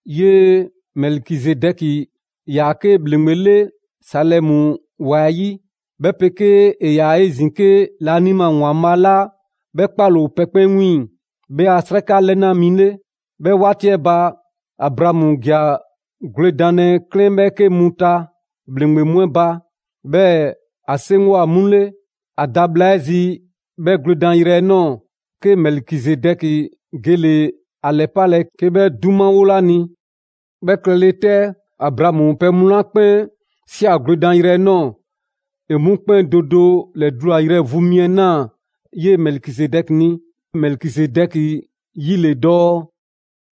'Yee‑ Mɛlikizedɛki 'yaa‑ 'ke ‑bhleŋgbe 'le Salɛmu ‑wa 'ɛ 'yi, 'bhɛ 'pegee ‑e ‑yaa 'ezin‑ 'ke laanima ‑Waanbhaa' 'la 'bhɛ 'kpaale‑ ‑o pɛ 'kpɛn 'wiiŋ‑ 'bhɛ a 'sraka 'lɛna mi 'le. 'Bhɛ 'waati 'ɛ ba, Abraamu ‑ja gwledanlɛ 'klɛɛn 'bhɛɛke mu ta ‑bhleŋgbe mu 'ɛ ba, 'bhɛɛ‑ ‑a 'seŋgwa‑ 'mu 'le. ‑A da bhla 'ɛ zi 'bhɛ gwledanyrɛ 'ɛ ꞊nɔɔ, 'ke Mɛlikizedɛki gele‑ ‑a ‑lɛpalɛ 'ke 'bhɛ 'dumawole 'a ni. 'Bhɛ klɛle 'tɛ, Abraamu pɛ mu 'la 'kpɛn ꞊sia gwledanyrɛ 'ɛ ꞊nɔɔ ‑e mu 'kpɛn do do 'lɛdulayrɛ vu mi 'ɛ ꞊naa 'yee‑ Mɛlikizedɛki ni. Mɛlikizedɛki 'yi ‑le dɔɔ: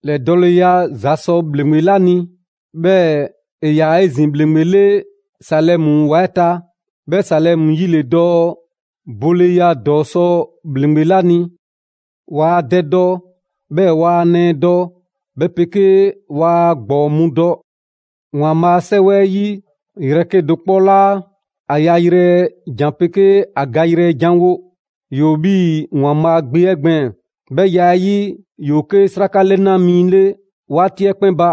«‑lɛdɔɔleya ‑za sɔ ‑bhleŋgbe 'la ni.» 'Bhɛɛ‑ ‑e ‑yaa 'ezin‑ ‑bhleŋgbe 'le Salɛmu ‑wa 'ɛ ta, 'bhɛ Salɛmu 'yi ‑le dɔɔ: «Boleya ‑dɔɔ sɔ ‑bhleŋgbe 'la ni.» Waa dɛ dɔ, 'bhɛɛ‑ waa ‑a nɛɛ dɔ, 'bhɛ 'pegee waa ‑a ‑gbɔɔ mu dɔ. ‑Waanbhaa' a 'Sɛwɛ 'ɛ 'yi yrɛ 'kedo‑ 'kpɔ 'laa ‑a yayrɛ jan 'pegee ‑a gayrɛ ‑jan wo. ‑Yoo 'bhii‑ ‑Waanbhaa' Gbe 'ɛ gbɛɛn‑; 'bhɛ ya 'ɛ 'yi, ‑yoo 'ke 'sraka 'lɛna mi 'le 'waati 'ɛ 'kpɛn ba.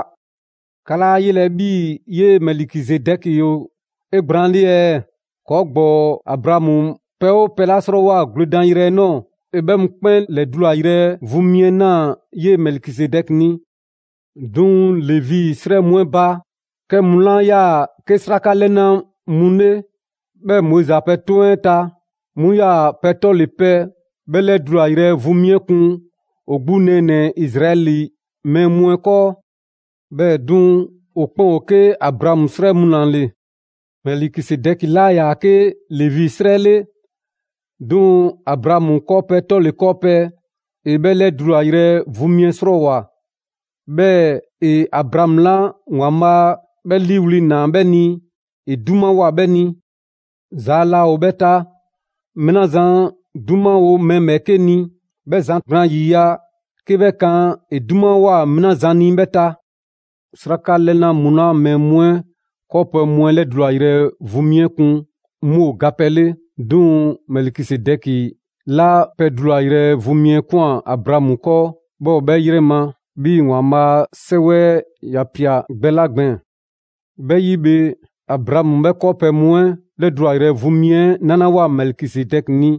'Ka 'laa ‑a yelɛ 'bhii‑ 'yee‑ Mɛlikizedɛki ‑o 'egblaanle ɛɛ? ‑Kɔɔ' ‑gbɔɔ Abraamu 'pɛ 'oo pɛ 'la 'srɔɔwoa‑ gwledan yrɛ 'ɛ ꞊nɔɔ, ‑e 'bhɛ 'mu 'kpɛn ‑lɛdulayrɛ vu mi 'ɛ ꞊naa 'yee‑ Mɛlikizedɛki ni. 'Duŋ‑ Levi 'srɛ mu 'ɛ ba, 'kɛ mu 'la 'yaa‑ 'ke 'sraka 'lɛna‑ mu 'le, 'bhɛɛ‑ Moizi ‑a pɛ 'toŋ 'ɛ ta, 'mu 'yaa‑ pɛ 'tɔle‑ pɛ 'bhɛ 'lɛdulayrɛ vu mi 'ɛ 'kun ‑o 'gbu nɛɛnɛ‑ Izraɛli mɛɛ mu 'ɛ 'kɔɔ. 'Bhɛɛ‑ 'duŋ‑, ‑o 'kpɛn ‑o 'ke Abraamu 'srɛ mu ‑la ‑le. Mɛlikizedɛki 'laa ‑yaa 'ke Levi 'srɛ 'le, 'duŋ‑ Abraamu 'kɔɔpɛ‑ 'tɔle‑ 'kɔɔpɛ‑, ‑e 'bhɛ 'lɛdulayrɛ vu mi 'ɛ 'srɔɔwoa꞊, 'bhɛɛ‑ ‑e Abraamu 'la ‑Waanbhaa' 'bhɛ 'liiwli‑ ‑naa 'bhɛ ni ‑e 'dumawoa 'bhɛ ni. Zaa laa ‑o 'bhɛ ta, mɛɛ 'la zan 'dumawo mɛɛ ‑bhɛɛke' ni, 'bhɛ zan gblaan ‑yiya' 'ke 'bhɛ kan ‑e 'dumawoa mɛɛ 'la zan ni 'bhɛ ta. 'Sraka 'lɛna mu la mɛɛ mu 'ɛ 'kɔɔpɛ‑ mu 'ɛ ‑lɛdulayrɛ vu mi 'ɛ kun, 'mu ‑o ga pɛ 'le. 'Duŋ‑, Mɛlikizedɛki 'la pɛ ‑lɛdulayrɛ vu mi 'ɛ ꞊kwan Abraamu 'kɔɔ, 'bhɛ ‑o 'bhɛ 'yrɛ ma 'bhii‑ ‑Waanbhaa' 'Sɛwɛ 'ɛ ‑ya ꞊pia gbɛ 'la gbɛɛn‑. 'Bhɛ 'yi bhe, Abraamu 'bhɛ 'kɔɔpɛ‑ mu 'ɛ 'lɛdulayrɛ vu mi 'ɛ 'nalawoa Mɛlikizedɛki ni,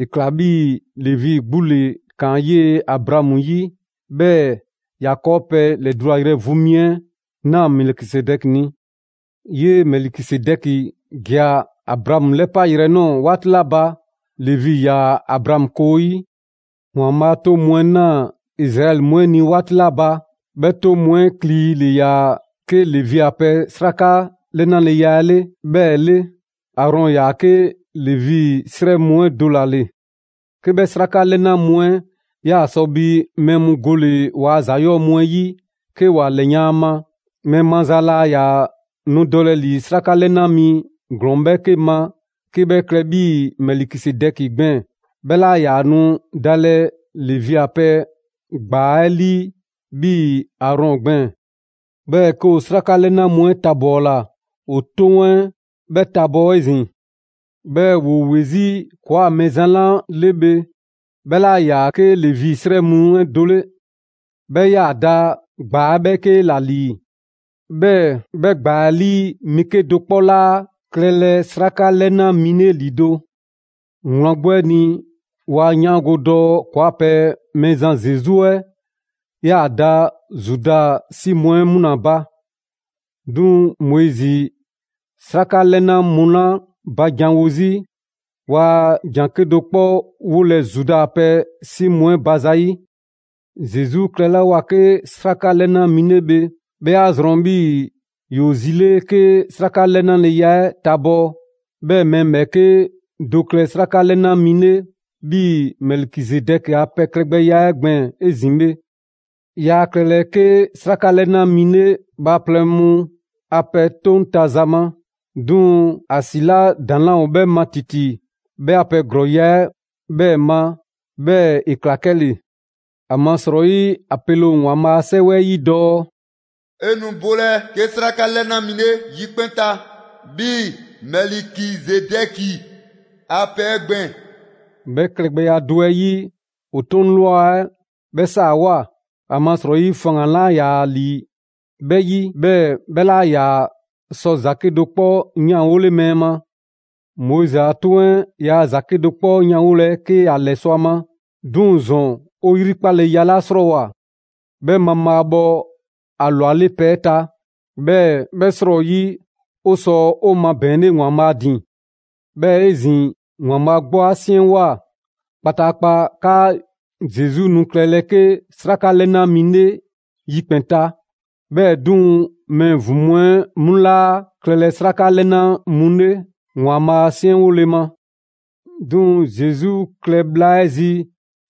‑e ꞊kla 'bhii‑ Levi 'gbu ‑le ‑kaan 'yee‑ Abraamu 'yi 'bhɛɛ‑ ‑ya 'kɔɔpɛ‑ ‑lɛdulayrɛ vu mi 'ɛ Mɛlikizedɛki ni. 'Yee‑ Mɛlikizedɛki ‑ja Abraamu 'lɛpa yrɛ nɔɔ‑ 'waati 'la ba, Levi ‑yaa Abraamu koo 'yi. ‑Waanbhaa' 'toŋ mu 'ɛ ꞊naa Izraɛli mu 'ɛ ni 'waati 'la ba, 'bhɛ 'toŋ mu 'ɛ kli ‑le ‑yaa 'ke Levi a pɛ 'sraka 'lɛnaleya 'ɛ 'bhɛɛ‑ 'le. Aarɔn ‑yaa 'ke Levi 'srɛ mu 'ɛ do ‑la ‑le. 'Ke 'bhɛ 'sraka 'lɛna mu 'ɛ 'yaa‑ sɔ bi mɛɛ mu gole‑ ‑waa' ‑za 'yɔɔ‑ mu 'ɛ 'yi 'ke ‑wa ‑lɛyan' ‑a ma, mɛɛ maza laa ‑yaa nu dɔlɛ ‑li 'sraka 'lɛna mi ‑glɔɔn 'bhɛɛke ma 'ke 'bhɛ klɛ 'bhii‑ Mɛlikizedɛki gbɛɛn‑, 'bhɛ 'laa ‑yaa nu dalɛ Levi a pɛ ‑gbaa 'ɛ 'lii 'bhii‑ Aarɔn gbɛɛn‑. 'Bhɛɛ‑ 'ke ‑o 'sraka 'lɛna mu 'ɛ tabɔɔla, ‑o 'toŋ 'ɛ 'bhɛ tabɔɔ 'ezin‑. 'Bhɛɛ‑ ‑woo ‑we 'zi ‑kɔɔa' Mɛɛzan 'la 'le bhe, 'bhɛ 'laa ‑yaa 'ke Levi 'srɛ mu 'ɛ do 'le. 'Bhɛ ‑yaa da ‑gbaa 'bhɛɛke ‑la ‑lii, 'bhɛɛ‑ 'bhɛ ‑gbaa 'ɛ 'lii mɛɛ 'kedo‑ 'kpɔ 'laa klɛlɛ 'sraka 'lɛnalɛ mi ‑lido'. Wlan 'gbu 'ɛ ni, 'wa 'yaango‑ dɔɔ ‑kɔɔa' pɛ Mɛɛzan Zesu 'ɛ 'yaa‑ da Zuda 'si mu 'ɛ 'mu ‑la ba; 'duŋ‑ Moizi 'sraka 'lɛna mu 'la ba janwo 'zi, yaa ‑jan 'kedo‑ 'kpɔ 'wolɛ‑ Zuda a pɛ 'si mu 'ɛ ba za 'yi. Zesu klɛlawoa 'ke 'sraka 'lɛna mi 'le bhe, 'bhɛ 'a zrɔn 'bhii‑ ‑yoo zi 'le 'ke 'sraka 'lɛnaleya 'ɛ tabɔɔ, 'bhɛɛ‑ mɛɛ ‑bhɛɛke' do klɛ 'sraka 'lɛna mi 'le 'bhii‑ Mɛlikizedɛki ‑a pɛ klɛgbɛya 'ɛ gbɛɛn‑ 'ezin‑ bhe. Yaa klɛlɛ 'ke 'sraka 'lɛna mi 'le bhaaplɛŋ mu a pɛ 'toŋ ta za ma; 'duŋ‑ ‑a ‑si 'la ‑daŋ' 'laa ‑o 'bhɛ ma ‑titi, 'bhɛ a pɛ ‑glɔɔya' 'ɛ 'bhɛɛ‑ ma, 'bhɛɛ‑ ‑e ‑kla 'kɛle‑. ‑Amasrɔyi ‑a pele ‑o ‑Waanbhaa' a 'Sɛwɛ 'ɛ 'yi dɔɔ: «'E nu bolɛ 'ke 'sraka 'lɛna mi 'le yikpɛn‑ ta 'bhii‑ Mɛlikizedɛki a pɛ 'ɛ gbɛɛn‑.» 'Bhɛ klɛgbɛya do 'ɛ 'yi, ‑o 'toŋ ꞊lwa 'ɛ 'bhɛ 'saawoa‑, ‑amasrɔyi faŋgan‑ 'laa ‑yaa ‑li 'bhɛ 'yi, 'bhɛɛ‑ 'bhɛ 'laa ‑yaa sɔ ‑za 'kedo‑ 'kpɔ 'yanwole mɛɛ ma. Moizi a 'Toŋ 'ɛ yaa ‑za 'kedo‑ 'kpɔ 'yanwolɛ 'ke ‑ya ‑lɛsɔ' a ma. 'Duŋ‑ ‑zɔn 'o ‑yrikpaleya 'la 'srɔɔwoa‑, 'bhɛ mabhaabhɔ ‑a ‑lwale' pɛ 'ɛ ta, 'bhɛɛ‑ 'bhɛ 'srɔyi 'o sɔ 'o mabɛɛnle ‑Waanbhaa' ‑din. 'Bhɛɛ‑ 'ezin‑, ‑Waanbhaa' 'gbu 'a 'siɛnwoa꞊ kpataakpa 'kaa Zesu nu klɛlɛ 'ke 'sraka 'lɛna mi 'le yikpɛn‑ ta. 'Bhɛɛ‑ 'duŋ‑, mɛɛ ‑vin mu 'ɛ 'mu 'laa klɛlɛ 'sraka 'lɛna mu 'le ‑Waanbhaa' 'siɛnwole ma. 'Duŋ‑ Zesu klɛ bhla 'ɛ zi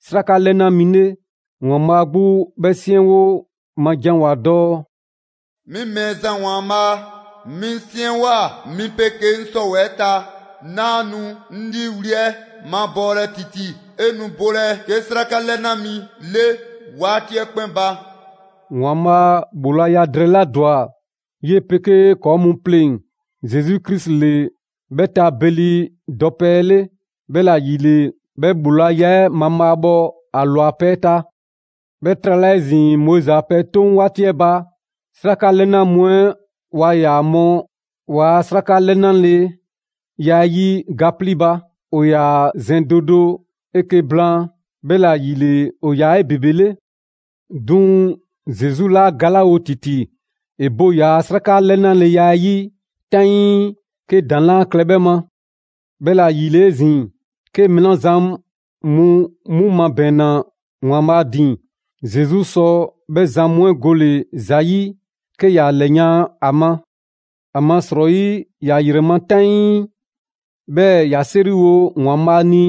'sraka 'lɛna mi 'le, ‑Waanbhaa' 'gbu 'bhɛ 'siɛnwo ma janwoa‑ dɔɔ: «'Mi Mɛɛzan ‑Waanbhaa', 'mi 'siɛnwoa‑ 'mi 'pegee 'ŋ 'sɔwɛɛ‑ ta, 'naa nu 'ŋ 'liiwli‑ 'ɛ mabɔɔlɛ ‑titi, 'e nu bolɛ 'ke 'sraka 'lɛna mi 'le waati 'ɛ 'kpɛn ba.» ‑Waanbhaa' ‑bhoolaya drɛɛ 'la ‑dwa 'yee‑ 'pegee 'kɔɔ‑ mu 'pleŋ‑, Zesu Krisi ‑le 'bhɛ ta beli dɔpɛ 'ɛ 'le. 'Bhɛla ‑yile, 'bhɛ ‑bhoolaya 'ɛ mabhaabhɔ ‑a ‑lwa pɛ 'ɛ ta. 'Bhɛ trala 'ezin, Moizi a pɛ 'toŋ 'waati 'ɛ ba, 'sraka 'lɛna mu 'ɛ waa ‑yaa mɔ ‑waa' 'sraka 'lɛnaleya 'ɛ 'yi ga 'plii ba. ‑O ‑yaa zɛn do do 'eke‑ blaan, 'bhɛla‑ ‑yile ‑o 'yaa‑ 'ebebele. 'Duŋ‑, Zesu 'laa galawo ‑titi, ‑e bo ‑yaa' 'sraka 'lɛnaleya 'ɛ 'yi 'taŋii 'ke ‑daŋ' 'laa klɛ 'bhɛ ma. 'Bhɛla‑ ‑yile 'ezin‑, 'ke mɛɛ 'la zan mu 'mu mabɛɛnna ‑Waanbhaa' ‑din, Zesu sɔ 'bhɛ zan mu 'ɛ gole ‑za ‑yi 'ke ‑ya ‑lɛyan' a ma; ‑amasrɔyi ‑ya ‑yrɛ ma 'taŋii, 'bhɛɛ‑ ‑ya 'seriwo ‑Waanbhaa' ni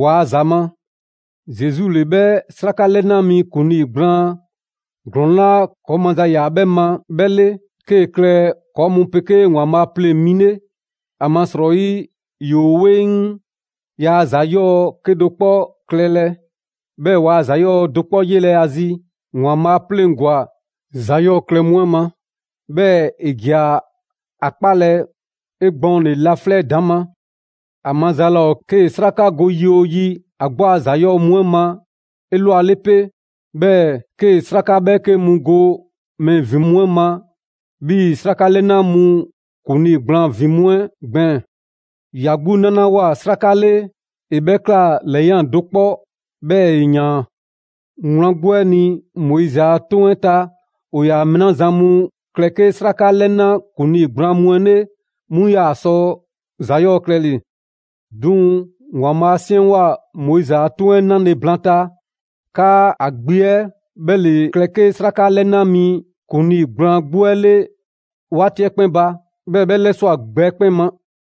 ‑waa' ‑za ma. Zesu ‑le 'bhɛ 'sraka 'lɛna mi ‑kuŋlii gblaan ‑glɔɔn 'la ‑kɔɔ' maza ‑yaa 'bhɛ ma 'bhɛ 'le, 'kee‑ klɛ ‑kɔɔ' mu 'pegee ‑Waanbhaa' pleŋ‑ mi 'le. ‑Amasrɔyi ‑yoo 'weŋ, ‑yaa ‑za 'yɔɔ‑ 'kedo‑ 'kpɔ klɛlɛ, 'bhɛɛ‑ waa ‑za 'yɔɔ‑ do 'kpɔ 'yelɛ‑ ‑a zi; ‑Waanbhaa' 'a 'pleŋgwa‑ ‑za 'yɔɔ‑ klɛ mu 'ɛ ma, 'bhɛɛ‑ ‑e ‑ja ‑a 'kpalɛ‑ 'egbɔɔnle laflɛ' 'ɛ ‑daŋ' ma. ‑A maza laa ‑o 'kee‑ 'sraka go yi 'oo yi ‑a 'gbu a ‑za 'yɔɔ‑ mu 'ɛ ma 'elwale 'pe, 'bhɛɛ‑ 'kee‑ 'sraka ‑bhɛɛke' mu go mɛɛ ‑vin mu 'ɛ ma, 'bhii‑ 'sraka 'lɛna mu ‑kuŋlii gblaan ‑vin mu 'ɛ gbɛɛn‑. ‑Ya 'gbu 'nalawoa 'sraka 'le, ‑e 'bhɛ ꞊kla ‑lɛyan' do 'kpɔ, 'bhɛɛ‑ ‑e ‑yaan. Wlan 'gbu 'ɛ ni, Moizi a 'Toŋ 'ɛ ta, ‑o ‑yaa mɛɛ 'la zan mu klɛ 'ke 'sraka 'lɛna ‑kuŋlii gblaan mu 'ɛ 'le, 'mu 'yaa‑ sɔ ‑za 'yɔɔ‑ klɛle‑. 'Duŋ‑ ‑Waanbhaa' 'a 'siɛnwoa‑ Moizi a 'toŋ 'ɛ 'nale‑ blaanta, 'kaa ‑a Gbe 'ɛ 'bhɛ ‑le klɛ 'ke 'sraka 'lɛna mi ‑kuŋlii gblaan 'gbu 'ɛ 'le 'waati 'ɛ 'kpɛn ba; 'bhɛɛ‑ 'bhɛ 'lɛswa꞊ gbɛ 'ɛ 'kpɛn ma.